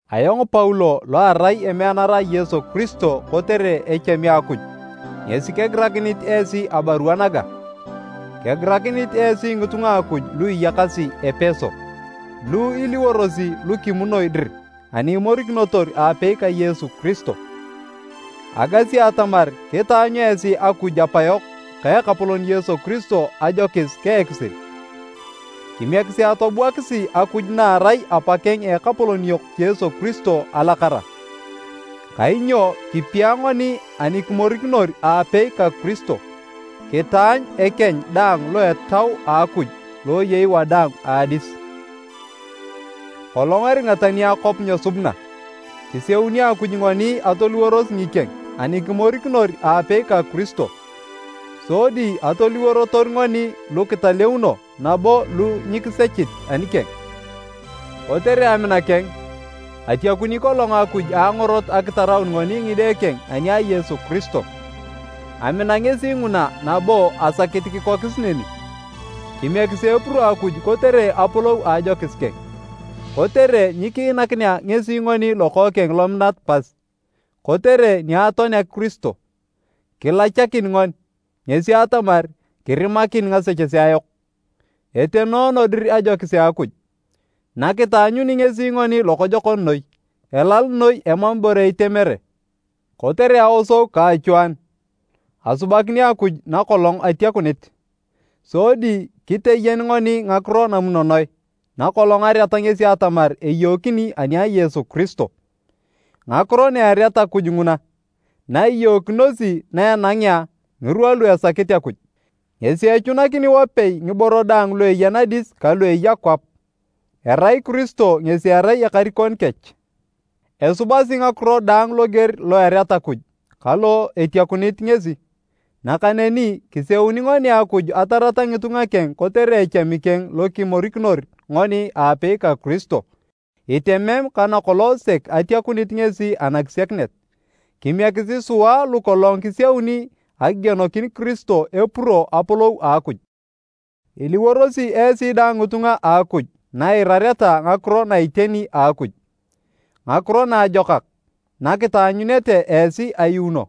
Ayong Paulo lo arai emeanara a Yesu Kiristo kotere echami a Akuj, ngesi kegirakinit esi abarua naga. Kegirakinit esi ngitunga a Akuj lu iyakasi Epeso, lu iliworosi lu kimunoi dir ani imorikinotor aapei ka Yesu Kiristo. Agasi atamar kitaanyu esi Akuj Apayok ka Ekapolon Yesu Kiristo ajokis ka ekisil. Kimiekisi atobuakisi Akuj na erai Apakeng a Ekapolon yok Yesu Kiristo alakara! Kainyo kipia ngoni ani kimorikinor aapei ka Kiristo, kitaanyu ekeny daang lo Etau a Akuj lo eyei wadaang a adis. Kolong eringa tani akwap nyesubuna, kiseuni Akuj ngoni atoliworos ngikeng ani kimorikinor aapei ka Kiristo, sodi atoliworotor ngoni lu kitaleuno nabo lu nyikisechit anikeng. Kotere amina keng atiakuni kolong Akuj a angorot akitaraun ngoni ngide keng ani a Yesu Kiristo, amina ngesi nguna nabo asakit kikokis neni. Kimiekisi epuro Akuj kotere apolou a ajokis keng, kotere nikiinakinea ngesi ngoni Lokookeng lominat pas! Kotere ni atoanea Kiristo, kilachakin ngoni, ngesi atamar, kirimakin ngasechesea yok. Etenoono dir ajokis a Akuj, nakitaanyuni ngesi ngoni lokojokon noi, elal noi emam ibore itemere! Kotere aosou ka achwaanu, asubakini Akuj nakolong atiakunit. Sodi kiteyen ngoni ngakiro namunonoe nakolong areat ngesi atamar eyookini ani a Yesu Kiristo. Ngakiro na ereat Akuj nguna, na iyookinosi na enangea ngirwa lu esakit Akuj, ngesi echunakini wapei ngiborei daang lu eya nadis ka lu eya kwap, erai Kiristo ngesi erai ekarikon kech. Esubasi ngakiro daang loger lo ereat Akuj ka lo etiakunit ngesi, nakaneni kiseuni ngoni Akuj atarata ngitunga keng kotere echami keng lokimorikinor ngoni aapei ka Kiristo, itemem ka nakolong sek atiakunit ngesi anakisiakinet. Kimiekisi sua lukolong kisiauni akigienokin Kiristo epuro apolou a Akuj! Iliworosi esi dang ngitunga a Akuj na iirareta ngakiro na iteni a Akuj, Ngakiro Naajokak nakitaanyunete esi ayuuno.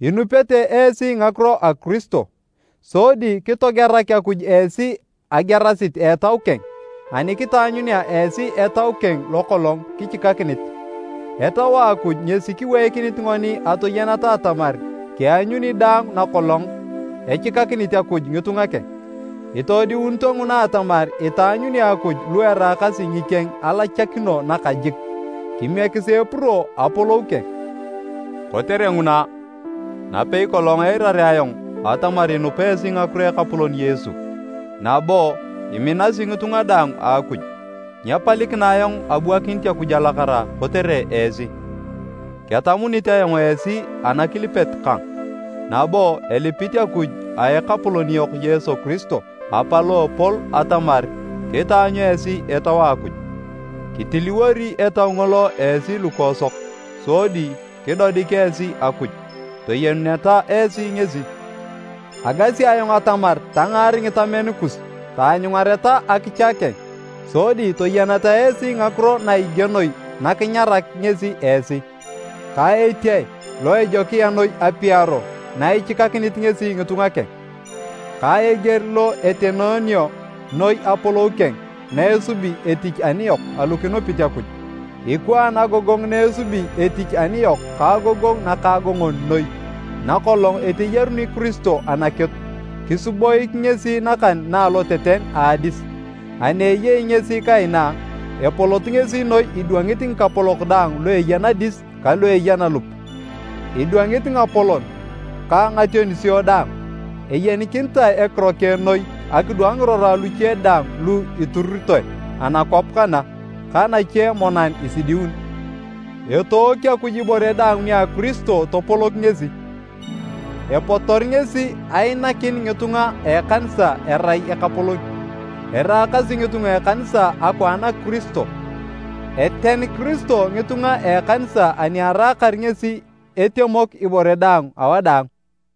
Inupete esi ngakiro a Kiristo, sodi kitogerak Akuj esi agerasit a Etau keng ani kitaanyunea esi Etau keng lokolong kichikakinit. Etau a Akuj ngesi kiweikinit ngoni atoyeneta atamar kianyuni daang nakolong echikakinit Akuj ngitunga keng. Itoodiunito nguna atamar itaanyuni Akuj lu eraakasi ngikeng alachakino nakajik. Kimiekisi epuro apolou keng! Kotere nguna, napei kolong eirarea ayong atamar inupa esi ngakiro a Ekapolon Yesu nabo iminasi ngitunga daang a Akuj, nyepalikina ayong abuakinit Akuj alakara kotere esi. Ketamunit ayong esi anakilipet kang nabo elipit Akuj a Ekapolon yok Yesu Kiristo, Apa lo epol atamar kitaanyu esi Etau a Akuj. Kitiliwori Etau ngolo esi lukoosok sodi kidodik esi Akuj, toyenuneta esi ngesi. Agasi ayong atamar tangaar ngitamen kus taanyungareta akicha keng. Sodi toyeneta esi ngakiro na igienoi nakinyarak ngesi esi, ka etiae lo ejokia noi apiaro na ichikakinit ngesi ngitunga keng. Ka eger lo etenoonio noi apolou keng na esubi etich aniyok alu kinupit Akuj. Ikwaan agogongu na esubi etich aniyok ka agogongu nakaagongon noi nakolong eteyaruni Kiristo anakitu, kisiboik ngesi nakan na aloteten a adis. Ani eyei ngesi kaina, epolot ngesi noi idwangit ngikapolok daang lu eya nadis kalu eya nalup, idwangit ngapolon ka ngationisio daang. Eyenikinitae ekiro keng noi akidwang ngirora luche daang lu iturutoe anakwap kana ka nache monan isidiun. Etook Akuj ibore daang nia Kiristo topolok ngesi, epotor ngesi ainakin ngitunga a ekanisa erai Ekapolon. Eraakasi ngitunga a ekanisa akwaan a Kiristo, eten Kiristo ngitunga a ekanisa ani eraakar ngesi etemok ibore daang awadaang.